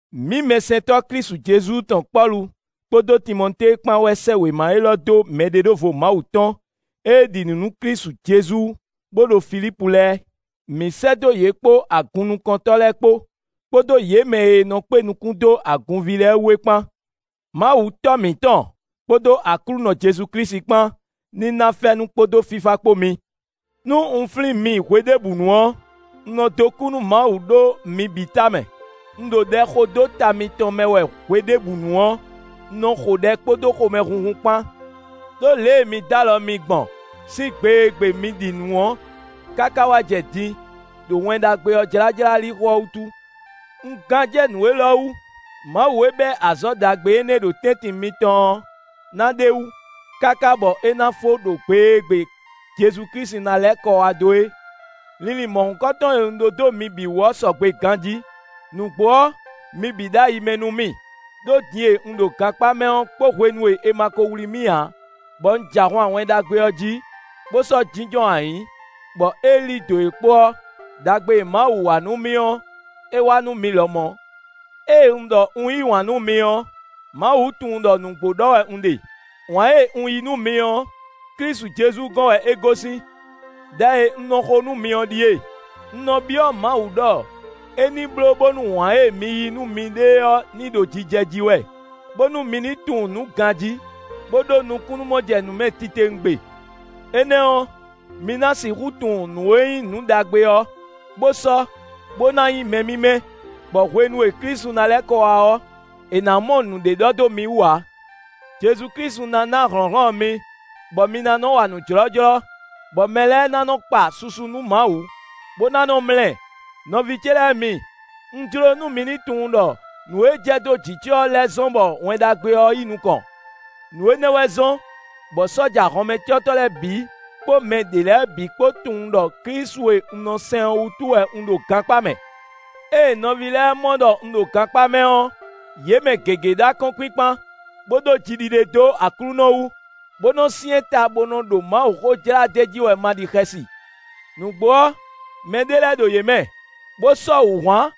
Mǐ mɛsɛntɔ́ Klísu Jezu tɔn Pɔ́lu kpódó Timɔtée kpán wɛ sɛ́ wěma élɔ́ dó mɛɖeɖóvo Mawu tɔn e ɖi nǔ nú Klísu Jezu bó ɖo Filípu lɛ́ɛ; mǐ sɛ́ dó yě kpó agunnukɔntɔ́ lɛ́ɛ kpó, kpódó yě mɛ e nɔ kpé nukún dó agunví lɛ́ɛ wú é kpán. Mawu Tɔ́ mǐtɔn kpódó Aklúnɔ Jezu Klísu kpán ní ná fɛ́nú kpódó fífá kpó mi. Nú un flín mi hweɖěbǔnu ɔ́, un nɔ dó kú nú Mawu ɖó mi bǐ ta mɛ. Un ɖo ɖɛ xo dó ta mitɔn mɛ wɛ hweɖěbǔnu ɔ́, un nɔ xo ɖɛ kpódó xomɛhunhun kpán. Đó lě e mi dó alɔ mì gbɔn sín gbe e gbe mi ɖi nǔ ɔ́, káká wá jɛ din, ɖo Wɛn Ɖagbe ɔ́ jlájlá lixo ɔ́ wútu. Un gán jɛ nǔ élɔ́ wú: Mawu e bɛ́ azɔ̌ ɖagbe énɛ́ ɖo tɛ́ntin mitɔn ɔ́ ná ɖ'é wú, káká bɔ é ná fó ɖo gbe e gbe Jezu Klísu ná lɛ́ kɔ wá dó é. Linlin mɔ̌hunkɔtɔn e un ɖó dó mi bǐ wú ɔ́ sɔgbe ganjí. Nǔgbó ɔ́, mi bǐ ɖo ayi mɛ nú mì, ɖó din e un ɖo gankpá mɛ ɔ́ kpó hwenu e è ma ko wlí mì ǎ, bɔ un jɛ ahwan Wɛn Ɖagbe ɔ́ jí, bó sɔ́ jínjɔ́n ayǐ, bɔ é lí dǒ é kpó ɔ́, ɖagbe e Mawu wa nú mì ɔ́, é wa nú mi lɔmɔ̌. Ée un ɖɔ un yí wǎn nú mi ɔ́, Mawu tunwun ɖɔ nǔgbó ɖɔ wɛ un ɖe. Wǎn e un yí nú mi ɔ́, Klísu Jezu gɔn wɛ é gosín. Đɛ e un nɔ xo nú mi ɔ́ ɖíe: un nɔ byɔ́ Mawu ɖɔ é ní bló bónú wǎn e mi yí nú miɖée ɔ́ ní ɖo jijɛ jí wɛ, bónú mi ní tunwun nǔ ganjí, bó ɖó nukúnnú-mɔjɛnǔmɛ titewungbe. Énɛ́ ɔ́, mi ná sixú tunwun nǔ e nyí nǔ ɖagbe ɔ́ bó sɔ́ bó ná nyí mɛ mímɛ́, bɔ hwenu e Klísu ná lɛ́ kɔ wá ɔ́, è nǎ mɔ nǔɖé ɖɔ dó mi wú ǎ. Jezu Klísu ná ná hlɔ̌nhlɔ́n mi, bɔ mi ná nɔ wa nǔ jlɔ́jlɔ́, bɔ mɛ lɛ́ɛ ná nɔ kpa susu nú Mawu, bó ná nɔ mlá ɛ. Nɔví ce lɛ́ɛ mi, un jló nú mi ní tunwun ɖɔ nǔ e jɛ dó jǐ ce ɔ́ lɛ́ zɔ́n bɔ Wɛn Ɖagbe ɔ́ yi nukɔn. Nǔ énɛ́ wɛ zɔ́n, bɔ sɔ́ja hɔnmɛcɔ́tɔ́ lɛ́ɛ bǐ kpó mɛ ɖě lɛ́ɛ bǐ kpó tunwun ɖɔ Klísu e un nɔ sɛn ɔ́ wútu wɛ un ɖo gankpá mɛ. Ée nɔví lɛ́ɛ mɔ ɖɔ un ɖo gankpá mɛ ɔ́, yě mɛ gěgé ɖó akɔ́nkpinkpan, bó ɖó jiɖiɖe dó Aklúnɔ wú, bó nɔ syɛ́n ta bó nɔ ɖo Mawuxó jlá d'é jí wɛ ma ɖi xɛsi. Nǔgbó ɔ́, mɛɖé lɛ́ɛ ɖo yě mɛ, bó sɔ́ wǔhwan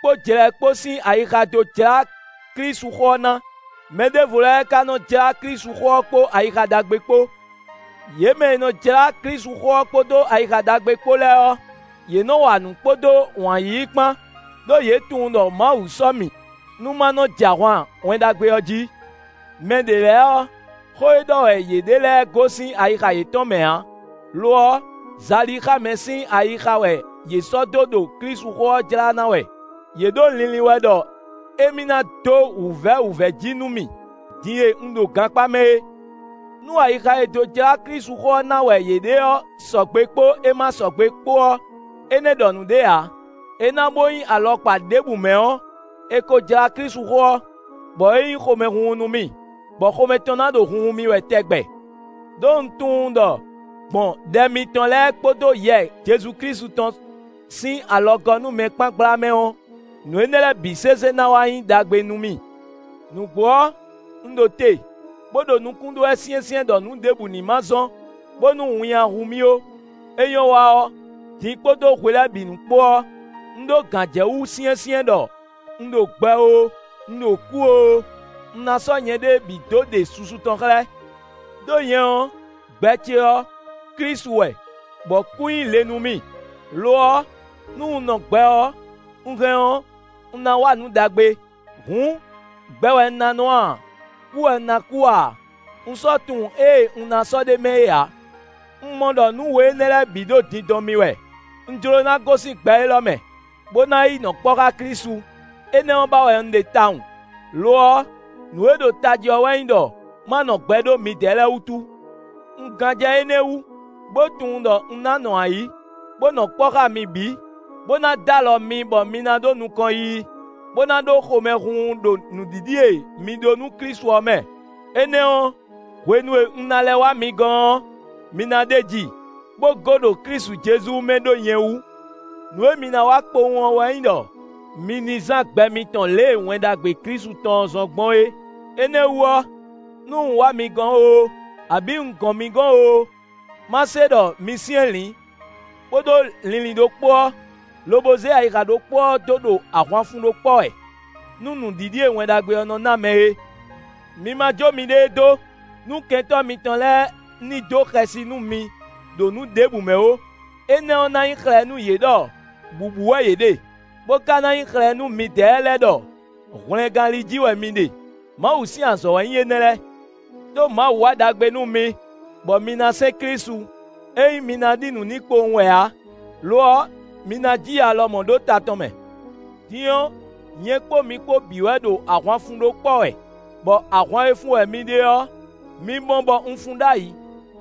kpó jlɛ kpó sín ayixa dó jlá Klísuxó ɔ́ ná; mɛ ɖěvo lɛ́ɛ ka nɔ jlá Klísuxó ɔ́ kpó ayixa ɖagbe kpó. Yě mɛ e nɔ jlá Klísuxó ɔ́ kpódó ayixa ɖagbe kpó lɛ́ɛ ɔ́, yě nɔ wa nǔ kpódó wǎn yíyí kpán, ɖó yě tunwun ɖɔ Mawu sɔ́ mì, nú ma nɔ jɛ ahwan Wɛn Ɖagbe ɔ́ jí. Mɛɖě lɛ́ɛ ɔ́, xó e ɖɔ wɛ yě ɖe lɛ́ɛ gosín ayixa yětɔn mɛ ǎ; lo ɔ́, zalixámɛ sín ayixa wɛ yě sɔ́ dó ɖo Klísuxó ɔ́ jlá ná wɛ; yě ɖo linlin wɛ ɖɔ émí ná dó wǔvɛ́ wǔvɛ́ jí nú mì din e un ɖo gankpá mɛ é. Nú ayixa e dó jlá Klísuxó ɔ́ ná wɛ yě ɖe ɔ́ sɔgbe kpó é ma sɔgbe kpó ɔ́, énɛ́ ɖɔ nǔɖé ǎ; é ná bó nyí alɔkpa ɖěbǔ mɛ ɔ́, è ko jlá Klísuxó ɔ́, bɔ é nyí xomɛhunhun nú mì, bɔ xomɛ tɔn ná ɖo hunhun mì wɛ tɛgbɛ. Đó un tunwun ɖɔ gbɔn ɖɛ mitɔn lɛ́ɛ kpódó Yɛ Jezu Klísu tɔn sín alɔgɔ́númɛ kpán gbla mɛ ɔ́, nǔ énɛ́ lɛ́ɛ bǐ sésé ná wá nyí ɖagbe nú mì. Nǔgbó ɔ́, un ɖo te, bó ɖo nukún ɖó wɛ syɛ́nsyɛ́n ɖɔ nǔ ɖěbǔ ní ma zɔ́n, bónú winnyá hu mì ó. É nyɔ́ wa ɔ́, din kpódó hwe lɛ́ɛ bǐ nu kpó ɔ́, un ɖó gǎnjɛwú syɛ́nsyɛ́n ɖɔ un ɖo gbɛ oo, un ɖo kú oo, un ná sɔ́ nyɛɖée bǐ dó ɖe susu tɔn xlɛ́. Đó nyɛ ɔ́, gbɛ ce ɔ́, Klísu wɛ, bɔ kú nyí le nú mì. Lo ɔ́, nú un nɔ gbɛ ɔ́, un hɛn ɔ́, un ná wa nǔ ɖagbe; hǔn, gbɛ wɛ un ná nɔ a, kú wɛ un ná kú a, un sɔ́ tunwun ée un ná sɔ́ ɖ'é mɛ é ǎ. Un mɔ ɖɔ nǔ we énɛ́ lɛ́ɛ bǐ ɖo dindɔn mì wɛ: un jló ná gosín gbɛ élɔ́ mɛ, bó ná yi nɔ kpɔ́ xá Klísu, énɛ́ ɔ́ ba wɛ un ɖe tawun. Lo ɔ́, nǔ e ɖo tají ɔ́ wɛ nyí ɖɔ ma nɔ gbɛ ɖó midɛɛ lɛ́ɛ wútu. Un gán jɛ énɛ́ wú, bó tunwun ɖɔ un ná nɔ ayǐ, bó nɔ kpɔ́ xá mi bǐ, bó ná dó alɔ mi bɔ mi ná ɖó nukɔn yiyi, bó ná ɖó xomɛhunhun ɖo nǔɖiɖi e mi ɖó nú Klísu ɔ́ mɛ. Énɛ́ ɔ́, hwenu e un ná lɛ́ wá mi gɔ́n ɔ́, mi na ɖeji, bó gó ɖo Klísu Jezu mɛ ɖó nyɛ wú. Nǔ e mi ná wa kpowun ɔ́ wɛ nyí ɖɔ mi ní zán gbɛ mitɔn lě e Wɛn Ɖagbe Klísu tɔn ɔ́ zɔ́n gbɔn é. Énɛ́ wú ɔ́, nú un wá mi gɔ́n oo, abǐ un gɔn mi gɔ́n oo, má se ɖɔ mi syɛ́nlǐn, bó ɖó linlin ɖokpó ɔ́, lobo zé ayixa ɖokpó ɔ́ dó ɖo ahwan fun ɖó kpɔ́ wɛ, nú nǔɖiɖi e Wɛn Ɖagbe ɔ́ nɔ na mɛ é. Mi ma jó miɖée dó nú kɛntɔ́ mitɔn lɛ́ɛ ní dó xɛsi nú mi ɖo nǔ ɖěbǔ mɛ ó; énɛ́ ɔ́ ná nyí xlɛ́ nú yě ɖɔ bǔbú wɛ yě ɖe, bó ka ná nyí xlɛ̌ nú midɛɛ lɛ́ɛ ɖɔ hwlɛngán li jí wɛ mi ɖe; Mawu sín azɔ̌ wɛ nyí énɛ́ lɛ́ɛ. Đó Mawu wa ɖagbe nú mi, bɔ mi ná sɛn Klísu; é nyí mi ná ɖi nǔ n'i kpowun wɛ ǎ, lo ɔ́, mi ná ji ya lɔmɔ̌ ɖó ta tɔn mɛ. Din ɔ́, nyɛ kpó mi kpó bǐ wɛ ɖo ahwan fun ɖó kpɔ́ wɛ, bɔ ahwan e fun wɛ mi ɖe ɔ́, mi mɔ bɔ un fun ɖ'ayǐ,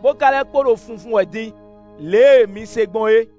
bó ka lɛ́ kpo ɖo funfun wɛ din, lě e mi se gbɔn é.